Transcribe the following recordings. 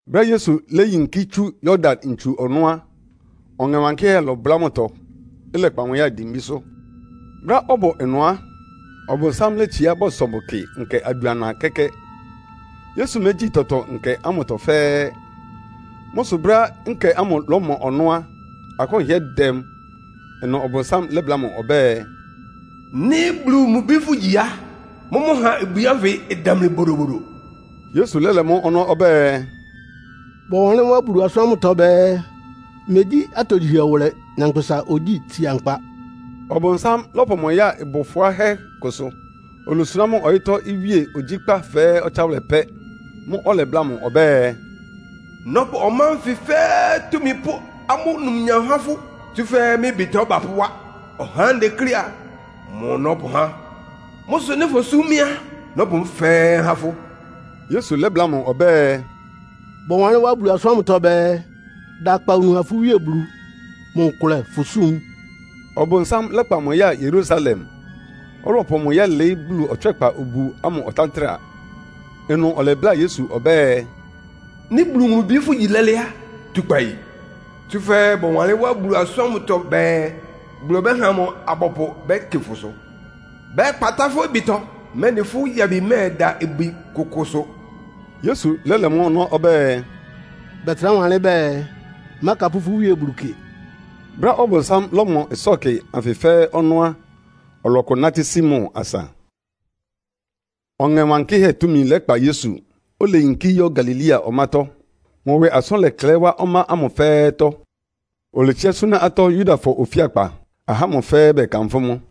Brɛ́á Yesu léyinkí tsú Yordan ntsu ɔnɔ́ á, Ɔŋɛ Wankɩ́hɛ́ lɔbʋlá mʋtɔ, ɩlɛkpa mʋ ya dimbísʋ́. Brɛ́á ɔbʋ ɩnʋ á, Ɔbʋnsám létsiá bɔsɔ mʋ kɩ nkɛ adʋana kɛ́kɛ́. Yesu mégyíi tɔtɔ nkɛ ámʋtɔ fɛ́ɛ́. Mʋ́ sʋ brɛ́á nkɛ ámʋ ɩlɔmɔ ɔnɔ́ á, akʋ́n hɩ́ɛ́ dɛ mʋ. Ɩnʋ Ɔbʋnsám lɛ́bláa mʋ ɔbɛ́ɛ, “Nɩ́ Bulu mʋ Bi fʋgyi á, mʋ́mʋ́ ha ibwi ánfɩ ɩdamli bodobodo.” Yesu lɛ́lɛ mʋ́ ɔnɔ́ ɔbɛ́ɛ, “Bɔwanlɩ́n wá Bulu asʋ́n ámʋtɔ bɛɛ, ‘Megyí atogyihɛ wʋlɛ nyankpʋsa ogyíi tsia nkpa.’” Ɔbʋnsám lɔ́pʋ mʋ ya ɩbʋ fʋ́áhɛ́ kʋsʋ. Olosuná mʋ ɔyɩ́tɔ́ iwíe ogyíkpá fɛ́ɛ́ ɔtsáwʋlɛ pɛ́. Mʋ́ʋ́ ɔlɛbláa mʋ ɔbɛ́ɛ, “Nɔ́pʋ ɔmá ánfɩ fɛ́ɛ́ túmi pʋ́ amʋ́ numnyam há fʋ́, tsúfɛ́ mɩ́ ɩbɩtɔ bapʋ́wá. Ɔhá ánɩ́ ndeklé a, mʋ nɔ́pʋhá. Mʋ́ sʋ nɩ́ fosúm mɩ́ á, nɔ́pʋ mʋ́ fɛ́ɛ́ há fʋ́.” Yesu lɛ́bláa mʋ ɔbɛ́ɛ, “Bɔwanlɩ́n wá Bulu asʋ́n ámʋtɔ bɛɛ, ‘Da akpawunu ha fʋ́ Wíe Bulu. Mʋ nkʋlɛ fʋ súm.’” Ɔbʋnsám lɛ́kpa mʋ ya Yerusalem, ɔlɔpʋ mʋ yɛ́lɩɩ́ Bulu ɔtswɛ́kpa obu ámʋ ɔtántra. Ɩnʋ ɔlɛbláa Yesu ɔbɛ́ɛ, “Nɩ́ Bulu mʋ Bi fʋ́gyi lɛ́lɛ́ á, tu kpayi. Tsúfɛ́ bɔwanlɩ́n wá Bulu asʋ́n ámʋtɔ bɛɛ, ‘Bulu ɔbɛ́ha mʋ abɔpʋ bɛ́kɩ fʋsʋ. Bɛ́kpatá fʋ́ ɩbɩtɔ, mɛ́nɩ fʋ́ yabi mɛ́ɛda ibwi kʋkʋsʋ.’” Yesu lɛ́lɛ mʋ́ ɔnɔ́ ɔbɛ́ɛ, “Bɛtrá wanlɩ́n bɛɛ, ‘Mákapʋ́ fʋ́ Wíe Bulu kɩ.’” Brɛ́á Ɔbʋnsám lɔ́mɔ ɩsɔ́kɩ anfɩ fɛ́ɛ́ ɔnɔ́ á, ɔlɔkʋ nátɩ́ sí mʋ asa. Ɔŋɛ Wankɩ́hɛ́ túmi lɛkpa Yesu, oleyinkí yɔ́ Galilea ɔmátɔ́. Mʋ ɩwɩ asʋ́n lɛklɛɩ́ wa ɔmá ámʋ fɛ́ɛ́tɔ́. Oletsiá súná atɔ́ Yudafɔ ofíakpa, ahá ámʋ fɛ́ɛ́ bɛkanfʋ́ mʋ.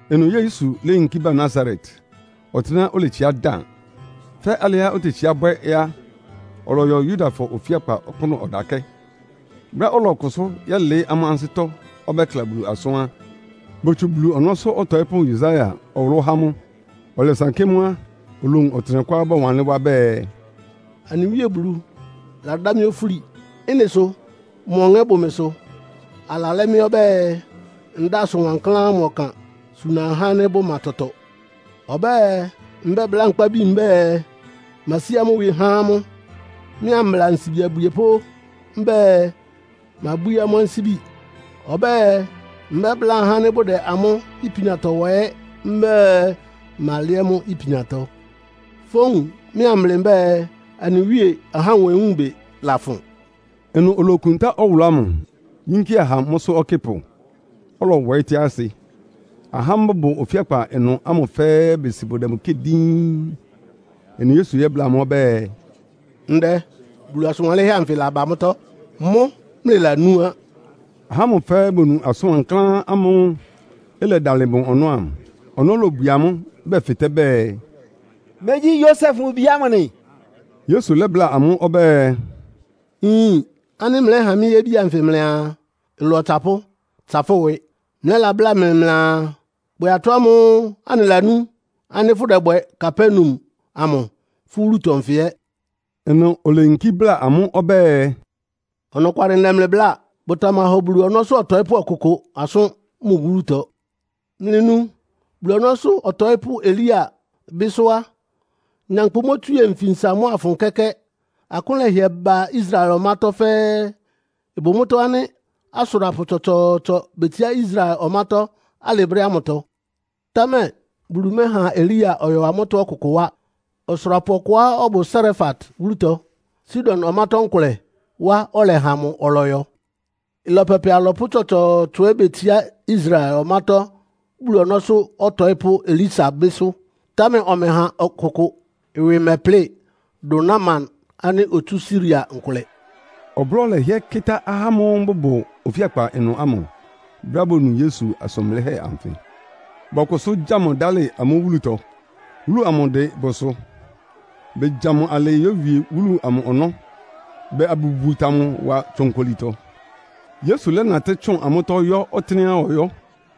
Ɩnʋ Yesu léyinkí bá Nasaret, ɔtɩ́nɛ́á oletsiá dan. Fɛ́ alɩá otetsíá bwɛ́ á, ɔlɔyɔ Yudafɔ ofíakpa ɔkpʋ́nʋ́ ɔdakɛ́. Brɛ́á ɔlɔkʋsʋ́ yɛ́lɩɩ́ amʋ́ ansɩ́tɔ́ ɔbɛ́kla Bulu asʋ́n á, botsu Bulu ɔnɔ́sʋ́ ɔtɔɩ́pʋ́ Yesaia ɔwʋlʋ́ há mʋ. Ɔlɛsankɩ́ mʋ́ á, olowun ɔtɩnɛkʋá bɔwanlɩ́n wá bɛɛ, “Anɩ Wíe Bulu ladá mɩ́ ofúli. Ɩ́nɩ sʋ mʋ Ɔŋɛ́ bʋ mɩsʋ. Alalɛ́ mɩ́ ɔbɛ́ɛ, ndáa asʋn wankláán ámʋ ɔkan suna ahá ánɩ́ bʋma tɔtɔ. Ɔbɛ́ɛ, mbɛ́bláa nkpábi mbɛ́ɛ, masí amʋ́ ɩwɩ há amʋ́. Mɩ́ ambla ansibi abwiepʋ́ mbɛ́ɛ, mabwíí amʋ́ ansíbi. Ɔbɛ́ɛ mbɛ́bláa ahá ánɩ́ bʋdɛ amʋ́ ipiantɔ wa ɛ́ mbɛ́ɛ, malɛ́ amʋ́ ipiantɔ. Fówun mɩ́ amblɩ mbɛ́ɛ, anɩ Wíe ahá nwewúunbɩ lafʋn.” Ɩnʋ olokuntá ɔwʋlʋ́ ámʋ, yínkía ha mʋ́sʋ́ ɔkɩ́pʋ, ɔlɔwɔɩ́ tɩ́á asɩ. Ahá ámʋ́ʋ́ bʋbʋ ofíakpa ɩnʋ ámʋ fɛ́ɛ́ besi bʋdɛ mʋ kɩ́ɩ díín. Ɩnʋ Yesu lɛ́bláa amʋ́ ɔbɛ́ɛ, “Ndɛ, Bulu asʋn wanlɩ́nhɛ́ anfɩ laba mʋ́tɔ́. Mʋ́ mlɩlanú á.” Ahá ámʋ fɛ́ɛ́ bonu asʋn wankláán ámʋ́ʋ́ ɩlɛdalɩ mʋ ɔnɔ́ ámʋ. Ɔnɔ́ lobwie amʋ́, bɛfɩtɛ́ bɛɛ, “Megyí Yosef mʋ bi ámʋ nɩ?” Yesu lɛ́bláa amʋ́ ɔbɛ́ɛ, “Nyin ánɩ́ mlɛ́ha mɩ́ yébi anfɩ mlɩaa, ‘Ɩlɔ ɔtsapʋ́, tsa fʋ́ ɩwɩ!’ Mlɛ́labláa mɩ mlɩaa, ‘Bwɛ atɔ́ ámʋ́ʋ́ anɩlanú ánɩ́ fʋ́dɛbwɛ Kapernaum amʋ fʋ́ wúlutɔ nfɩ ɛ́.’” Ɩnʋ oleyinkí bláa amʋ́ ɔbɛ́ɛ, “Ɔnɔkwalɩ ndɛ mlɩ bláa. Bʋtamahɔ Bulu ɔnɔ́sʋ́ ɔtɔɩ́pʋ́ ɔkʋkʋ asʋ́n mʋ wúlutɔ. “Mlɩnu, Bulu ɔnɔ́sʋ́ ɔtɔɩ́pʋ́ Elia bɩ́sʋ́ á, nyankpʋ mótswíe nfinsa mʋ́a ɩfʋn kɛ́kɛ́. Akʋ́n lɛhɩɛ ba Israel ɔmátɔ́ fɛ́ɛ́. Ɩbʋ mʋ́tɔ́ ánɩ́ asʋrapʋ tsɔtsɔɔtsɔ betsiá Israel ɔmátɔ́ alɩ brɛ́ ámʋtɔ, támɛ Bulu mɛ́ha Elia ɔyɔ amʋ́tɔ́ ɔkʋkʋ wá. Ɔsʋrapʋ ɔkʋá ɔbʋ Sarefat wúlutɔ, Sidon ɔmátɔ́ nkʋlɛ wá ɔlɛha mʋ ɔlɔyɔ. Ɩlɔ pɛpɛ alɔpʋ́ tsɔtsɔɔtsɔ ɛ́ betsiá Israel ɔmátɔ́ Bulu ɔnɔ́sʋ́ ɔtɔɩ́pʋ́ Elisa bɩ́sʋ́. Támɛ ɔmɛha ɔkʋkʋ ɩwɩ mɛplɩ́, dʋn Naaman ánɩ́ otsú Siria nkʋlɛ.” Ɔblɔ́ lɛhɩɛ kɩ́tá ahá ámʋ́ʋ́ bʋbʋ ofíakpa ɩnʋ ámʋ, brɛ́á bonu Yesu asʋn blɩ́hɛ́ anfɩ. Bɔkʋsʋ́ gya mʋ dálɩ amʋ́ wúlutɔ. Wúlu amʋ ɩdɩn bʋsʋ. Begya mʋ alɩɩ yówie wúlu amʋ ɔnɔ́, bɛɛ abʋwuta mʋ wa tsonkolitɔ. Yesu lɛ́natɩ́ tsʋn amʋ́tɔ́ yɔ́ ɔtɩ́nɛ́á ɔyɔ́.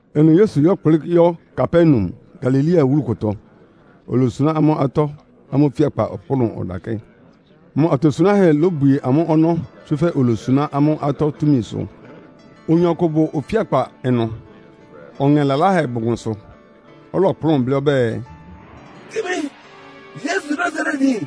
Ɩnʋ Yesu lɛ́kplɩ́ yɔ́ Kapernaum, Galilea wúlu kʋtɔ. Olosuná amʋ́ atɔ́ amʋ́ ofíakpa ɔkpʋ́nʋ́ ɔdakɛ́. Mʋ atosunáhɛ́ lobwie amʋ́ ɔnɔ́, tsúfɛ́ olosuná amʋ́ atɔ́ túmisʋ. Oyin ɔkʋ bʋ ofíakpa ɩnʋ, ɔŋɛ laláhɛ bʋ mʋsʋ. Ɔlɔkplʋ́n blɩ́ ɔbɛ́ɛ, “Kɩ mɩ! Yesu Nasaretyin,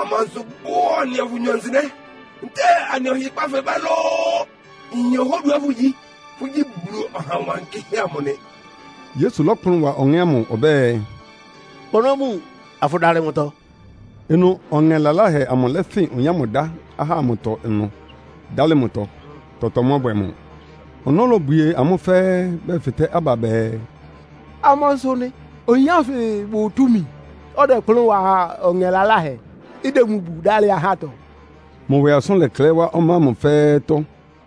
amansʋ bʋ anɩa fʋnyɔ nsɩnɛ́? Ntɛ́ɛ anɩ ɔhɩkpá fɛbá lóó? Nyin ɔhá oduá fʋ́gyi. Fʋ́gyí Bulu Ɔha Wankɩ́hɛ́ amʋ nɩ!” Yesu lɔ́kplʋn wa ɔŋɛ́ ámʋ ɔbɛ́ɛ, “Kpa ɔnɔ́ bun, afʋdalɩ mʋtɔ.” Ɩnʋ ɔŋɛ laláhɛ amʋ lɛ́fɩn oyin ámʋ dá ahá ámʋtɔ ɩnʋ, dálɩ mʋtɔ. Tɔtɔ mɔbwɛ mʋ. Ɔnɔ́ lobwie amʋ́ fɛ́ɛ́, bɛfɩtɛ́ aba bɛɛ, “Amansʋ nɩ? Oyin ánfɩ bʋ túmi, ɔdɛkplʋ́n wa ɔŋɛ laláhɛ, ɩdɛ mʋ bu, dálɩ ahátɔ?” Mʋ ɩwɩ asʋ́n lɛklɛɩ́ wá ɔmá ámʋ fɛ́ɛ́tɔ́.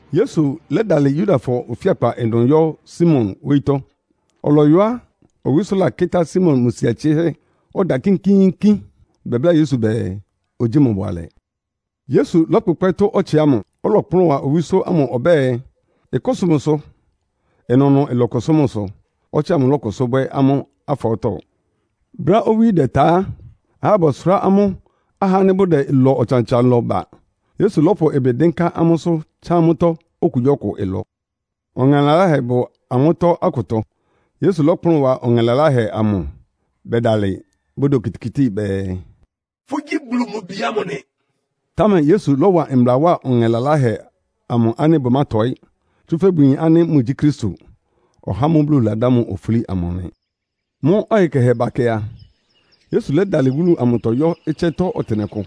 Yesu lɛ́dalɩ Yudafɔ ofíakpa ɩnʋ yɔ́ Simon wóyítɔ́. Ɔlɔyɔ á, owísó lakɩ́tá Simon mʋ sia tsɩ́hɛ́, ɔda kínkíínkín. Bɛbláa Yesu bɛɛ, ogyíi mʋ bʋalɛ. Yesu lɔ́kpʋkpɛ́ tʋ́ ɔtsɩ ámʋ, ɔlɔkplʋ́n wa owísó ámʋ ɔbɛ́ɛ, ɩkʋ́sʋ mʋsʋ. Ɩnʋnʋ ɩlɔkʋsʋ́ mʋsʋ, ɔtsɩ ámʋ lɔ́kʋsʋ́ bwɛ́ amʋ́ afɔɔ́tɔ. Brɛ́á owí dɛta á, ahá bɔsʋrá amʋ́ ahá ánɩ́ bʋdɛ ɩlɔ ɔtsan-ɔtsan lɔ ba, Yesu lɔ́pʋ ɩbɩ dɩ́nká amʋ́sʋ́ tsá amʋ́tɔ́ okugyíɔkʋ ɩlɔ. Ɔŋɛ laláhɛ bʋ amʋ́tɔ́ akʋtɔ. Yesu lɔ́kplʋn wa ɔŋɛ laláhɛ amʋ. Bɛdalɩ, bʋdɛ okitikíti bɛɛ, “Fʋ́gyí Bulu mʋ Bi ámʋ nɩ.” Támɛ Yesu lɔ́wa mbla wá ɔŋɛ laláhɛ amʋ ánɩ́ bʋmátɔɩ́, tsúfɛ́ bʋyin ánɩ́ mʋgyí Kristo, (ɔhá ámʋ́ʋ́ Bulu ladá mʋ ofúli amʋ) nɩ. Mʋ́ ɔyɩ kɛhɛ bakɛ a, Yesu lɛ́dalɩ wúlu amʋtɔ yɔ́ ɩtsɛ́tɔ́ ɔtɩnɛkʋ.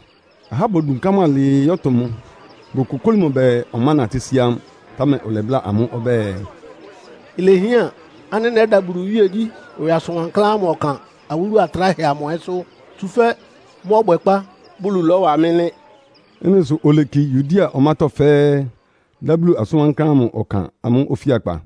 Ahá bodunká mʋ alɩɩ yɔ́tʋ mʋ, bokokóli mʋ bɛɛ ɔmánatɩ́ sí amʋ́. Támɛ ɔlɛbláa amʋ́ ɔbɛ́ɛ, “Ilehián ánɩ́ nɛ́da Bulu iwíegyí ɩwɩ asʋn wankláán ámʋ ɔkan awúlu atráhɛ amʋ ɛ́sʋ́. Tsúfɛ́ mʋ́ ɔbwɛkpá Bulu lɔ́wa mɩ́ nɩ́.” Ɩ́nɩ sʋ oleki Yudea ɔmátɔ́ fɛ́ɛ́, dá Bulu asʋn wankláán amʋ ɔkan amʋ́ ofíakpa.